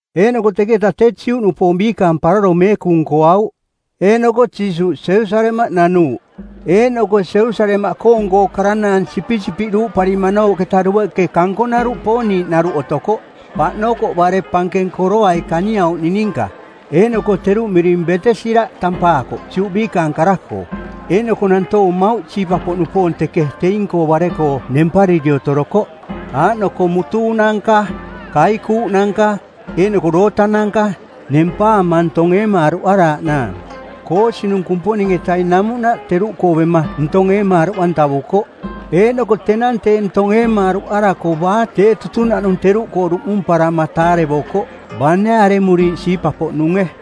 Eeꞌnoko teketa tee Juꞌnupoong biikaang paroro meekung nkoauꞌ. Eeꞌnoko Jiisuuꞌ Jerusalemaꞌ nanuuꞌ. Eeꞌnoko Jerusalemaꞌkoong karanaang sipisipiꞌ duparimanooꞌketa dueꞌke kankonaruꞌ pooniiꞌnaruꞌ otokoꞌ, paꞌnokoꞌ bare pankeng koroai kaniauꞌning ninka, eeꞌnoko teruꞌ miring Betesira tampaakoꞌ Juꞌ biikaang kara-koo. Eeꞌnoko nantoong mmauꞌ siipa-poꞌnupoong teke teing-koo bare-koo nempariri otorokoꞌ, aaꞌnoko mutuunanka, kaikuuꞌnanka, eeꞌnoko dootananka, nempaama ntong eemaaruꞌaraaꞌnaang. Koosinung˜ Kumponing-etaing namuꞌnaꞌ teruꞌkoo bema ntong eemaaruꞌantavukoꞌ, eeꞌnoko tenang tee ntong eemaaruꞌarako baa tee tutunaꞌnung teruꞌkoo duꞌmumparama taarevokoꞌ, bane aremuriiꞌ siipa-poꞌnunge.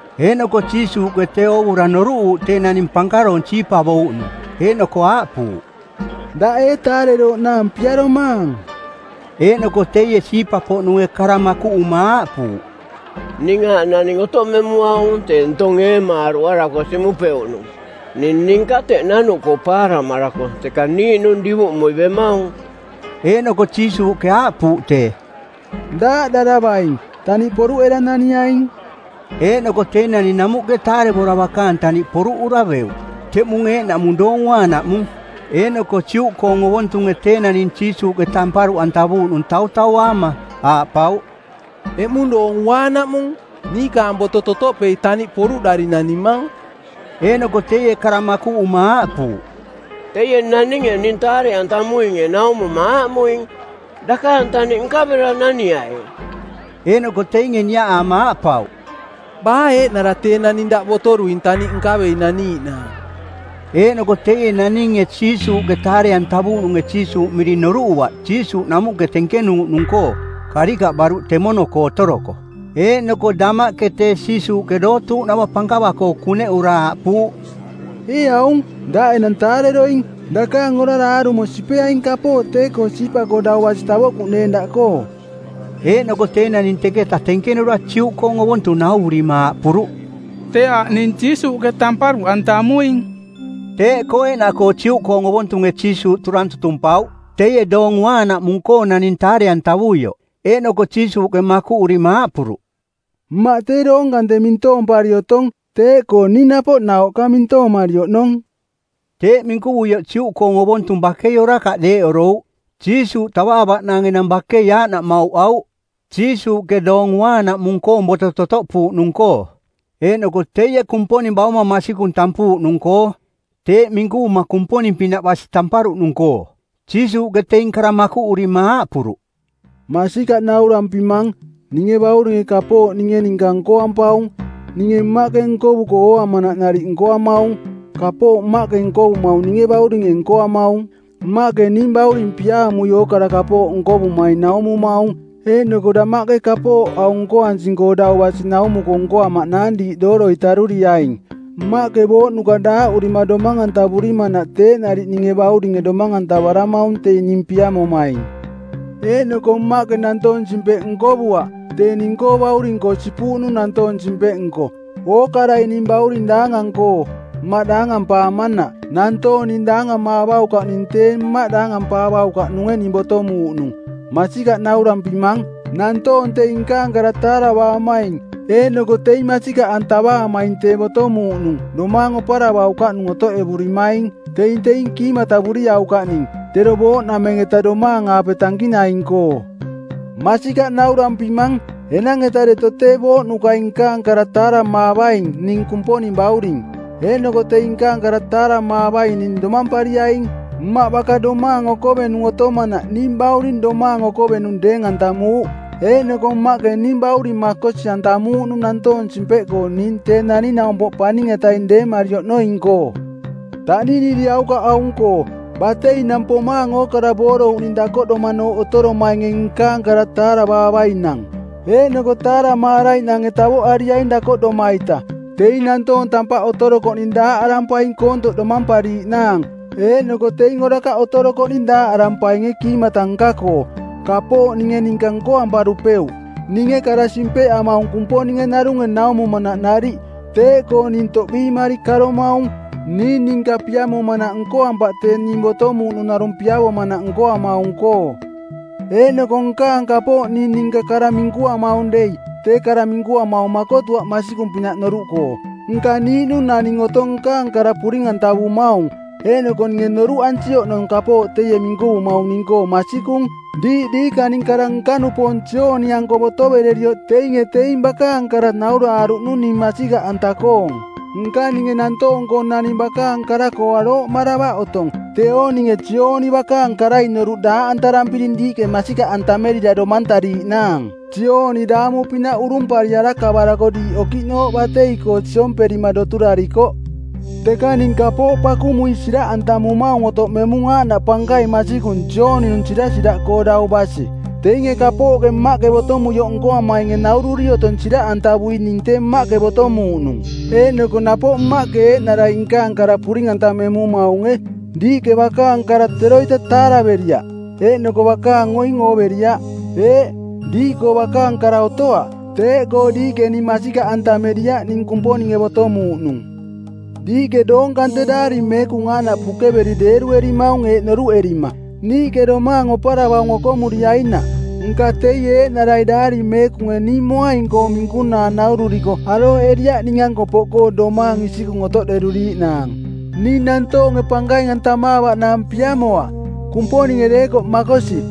Eeꞌnoko Jiisuuꞌke tee oovura noruꞌuuꞌ tee naning pankaroong siipavouꞌnung, eeꞌnoko aaꞌpuuꞌ, “Daꞌ ee taarerooꞌnaang piaromaang?” Eeꞌnoko teie siipa-poꞌnunge kara makuꞌuma aaꞌpuuꞌ, “Ning aaꞌ naning otoꞌmemuaung tee ntong eemaaruꞌarako siꞌmupeuꞌnung. Ning ninka teꞌ nanuꞌkoo paaramarako teka niiꞌnung divuꞌmui bemaung.” Eeꞌnoko Jiisuuꞌke aaꞌpuuꞌ tee, “Daaꞌdaravaing. Taniꞌ poruꞌera naniaing.” Eeꞌnoko tee naning namuꞌke taarevora bakaang taniꞌ poruꞌura beuꞌ. Teꞌmung eeꞌnaꞌmung Doong Uaanaꞌmung. Eeꞌnoko Juꞌkoong ovontunge tee naning Jiisuuꞌke tamparuꞌntavuuꞌnung tautauaama, aaꞌpauꞌ, “Eꞌmung Doong Uaanaꞌmung; niikaang boto totoꞌpei taniꞌ poruꞌdari nanimang.” Eeꞌnoko teie kara makuꞌuma aaꞌpuuꞌ, “Teie naninge ning taare-antamuinge naumuma aaꞌmuing, ‘Dakaang taniꞌ nkavera naniai.’” Eeꞌnoko teinge niaꞌaama aaꞌpauꞌ, “Baa eeꞌnara tee naning daꞌ botoruing taniꞌ nkavei naniiꞌnaang?” Eeꞌnoko teie naninge Jiisuuꞌke taare-antavuuꞌnunge Jiisuuꞌ miring noruꞌuaꞌ Jiisuuꞌ namuꞌke tenkenuuꞌnung-koo, karikaꞌ baruꞌ temono-koo otoroko. Eeꞌnoko damaꞌke tee Jiisuuꞌke dootuuꞌnava pankava-koo kuneꞌura aaꞌpuuꞌ, “Ee aung, daꞌ enang taareroing. Dakaang orara aarumo sipeaing kapooꞌ tee-koo siipa-koo dau basi tavoꞌkuꞌneeng daꞌkoo.” Eeꞌnoko tee naning teketa tenkenura Juꞌkoong ovontung nauvurima aaꞌpuruꞌ, “Tee aaꞌ ning Jiisuuꞌke tamparuꞌantamuing.” Teeꞌkoo eeꞌnaꞌkoo Juꞌkoong ovontunge Jiisuuꞌ turang tutumpauꞌ teie Doong Uaanaꞌmung-koo naning taare-antavuioꞌ. Eeꞌnoko Jiisuuꞌke makuꞌurima aaꞌpuruꞌ, “Mmaꞌ doong kante mintoompari otong, teeꞌkoo ning napoꞌ nauꞌka mintoomari oꞌnong. Teeꞌ minkuvuioꞌ Juꞌkoong ovontung bakei orakaꞌ deeꞌorouꞌ. Jiisuuꞌ tavaavaꞌnaang enang bakei aaꞌnaꞌ mauꞌauꞌ Jiisuuꞌke Doong Uaanaꞌmung-koong boto totoꞌpuuꞌnung-koo, eeꞌnoko teie Kumponing bauma masikung tampuuꞌnung-koo, teeꞌ minkuvuma Kumponing-pinaꞌ basi tamparuꞌnung-koo.” Jiisuuꞌke teing kara makuꞌurima aaꞌpuruꞌ, “Masikaꞌ naurampimang, ninge Bauringe kapooꞌ ninge ninka nkoampaung. Ninge Mmaꞌke nkovuko ooamanaꞌ nariꞌ nkoamaung. Kapooꞌ Mmaꞌke nkovumaung ninge Bauringe nkoamaung. Mmaꞌke ning Bauring piaamui ookara kapooꞌ nkovumaing naumumaung, eeꞌnoko damaꞌke kapooꞌ aung nkoansing-koo dau basi naumuko nkoamaꞌnaang diiꞌ dooroi taruriaing. Mmaꞌke booꞌnuka daaꞌurima domang-antavurimanaꞌ teeꞌ nariꞌ ninge Bauringe domang-antavaramaung teing ning piamomaing. Eeꞌnoko Mmaꞌke nantoong-simpeꞌ nkovuaꞌ, tee ning-koo Bauring-koo sipuuꞌnung nantoong simpeꞌnko˜, ookarai ning Bauring daangang-koo, Mmaꞌ daangampaamanaꞌ; Nantoong ning daangamaavaukaꞌning tee Mmaꞌ daangampaavaukaꞌnunge ning botomuuꞌnung. “Masikaꞌ naurampimang, nantoong teing nkaang kara taaravaamaing, eeꞌnoko teing masikaꞌantavaamaing tee botomuuꞌnung domaang oparavaukaꞌnung otoꞌevurimaing. Teing teing kiimatavuriaukaꞌning, tero booꞌnameng-eta domaang-aape tankinaing-koo. Masikaꞌ naurampimang, enang-eta deto tee booꞌnukai nkaang kara taaramaavainang ning Kumponing Bauring. Eeꞌnoko teing nkaang kara taaramaavaining domampariaing. Mmaꞌ baka domaang okovenung otomanaꞌ ning Bauring domaang okovenung deeng-antamuuꞌ. Eeꞌnoko Mmaꞌke ning bauring makosi-antamuuꞌnung nantoong simpeꞌkoo ning Tee Naning-naumpoꞌ Paning-etaing deemari oꞌnoing-koo. Taꞌniniriaukaꞌ aung-koo: bateinang pomaang ookara boorouꞌning dakoꞌdomanooꞌ otoromainge nkaang kara taaramaavainang. Eeꞌnoko taaramaaraiꞌnange tavoꞌariaing dakoꞌdoma-ita. Teing nantoong tampaꞌ otorokoꞌning daaꞌarampaing koontoꞌ domampariiꞌnaang, eeꞌnoko teing orakaꞌ otorokoꞌning daaꞌarampainge kiimata nka-koo.” “Kapooꞌ ninge ninka nkoamparupeuꞌ. Ninge kara simpeꞌamaung Kumponinge narunge naumumanaꞌ nariꞌ. Teeꞌkoo ning toꞌbiimari karomaung, ning ninka piamomanaꞌ nkoampaꞌ tee ning botomuuꞌnung narung piavomanaꞌ nkoamaung-koo. Eeꞌnoko nkaang kapooꞌkoo ning ninka kara minkuamaung dei, tee kara minkuamaung makotuaꞌ masikung-pinaꞌ noruꞌkoo. Nka niiꞌnung naning otong nkaang kara puring-antavumaung, eeꞌnoko ninge noruꞌansi oꞌnong kapooꞌ teie minkuvumaung ning-koo masikung. Diiꞌ diikaning kara nka-nupoong Jooni-anko botovererioꞌ teinge teing bakaang kara nauraaruꞌnung ning masikaꞌanta-koong. Nka ninge nantoong-koo naning bakaang kara-koo arooꞌmaravaꞌ otong. Teeo ninge Jooni bakaang karai noruꞌ daaꞌantarampiring diiꞌke masikaꞌantamerira domantariiꞌnaang. Jooni daamu-pinaꞌ urumpari arakavarako diiꞌ okiꞌnooꞌ batei-koo siomperima doturarikoꞌ. Teka ning kapooꞌ pakumui siraꞌantamumaung otoꞌmemung aaꞌnaꞌ pankaing masikung Jooni-nung sirasiraꞌkoo dau basi. Teinge kapooꞌke Mmaꞌke botomuioꞌ nkoamainge naururi otong siraꞌantavui ning tee Mmaꞌke botomuuꞌnung. Eeꞌnoko napoꞌ Mmaꞌke eeꞌnarai nkaang kara puring-antamemumaunge. Diiꞌke bakaang kara teroita taaraveriaꞌ, eeꞌnoko bakaang oing ooveriaꞌ. Eeꞌ, diiꞌkoo bakaang kara otoaꞌ. Teeꞌkoo diiꞌke ning masikaꞌantameriaꞌ ning Kumponinge botomuuꞌnung. Diiꞌke doong kante Daari Meekung aaꞌnaꞌ pukeveri deeruerimaung eeꞌ noruꞌerima, ‘Niiꞌke domaang oparavaung okomuriainaꞌ;’ Nka teie eeꞌnarai Daari Meekunge ning moaing-koong minkunaa naururiko arooꞌeriaꞌ ning-anko poꞌkoo domaang isikung otoꞌderuriiꞌnaang. “Ning nantoonge pankaing-antamaavaꞌnaang piamoaꞌ, Kumponinge deekoꞌ makosi.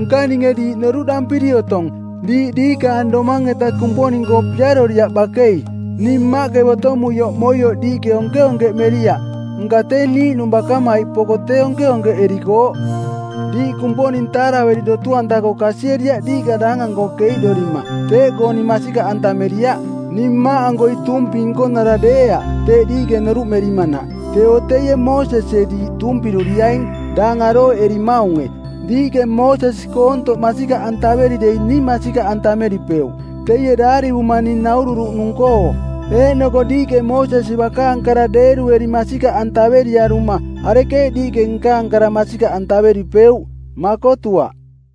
Nka ninge diiꞌ noruꞌdampiri otong, diiꞌ diikaang domang-eta Kumponing-koo piaroriaꞌ bakei. Ning Mmaꞌke botomuioꞌ moioꞌ diiꞌke onkeonkeꞌmeriaꞌ; nka tee niiꞌnung bakamaiꞌ poko tee onkeonkeꞌerikooꞌ. Diiꞌ Kumponing taaraveri dotu-anta-koo kasieriaꞌ diiꞌka daangang-koo keiꞌdorima. Teeꞌkoo ning masikaꞌantameriaꞌ. Ning Mmaꞌankoi tuumpi nkonara deeaꞌ teeꞌ diiꞌke noruꞌmerimanaꞌ; teeo teie Moosesie diiꞌ tuumpiruriaing, daang arooꞌerimaunge. Diiꞌke Moosesi koontoꞌ masikaꞌantaveri dei ning masikaꞌantameripeuꞌ, teie daarivuma ning naururuꞌnung-koo. Eeꞌnoko diiꞌke Moosesi bakaang kara deerueri masikaꞌantaveriaruma arekeeꞌ diiꞌke nkaang kara masikaꞌantameripeuꞌ? Makotuaꞌ.”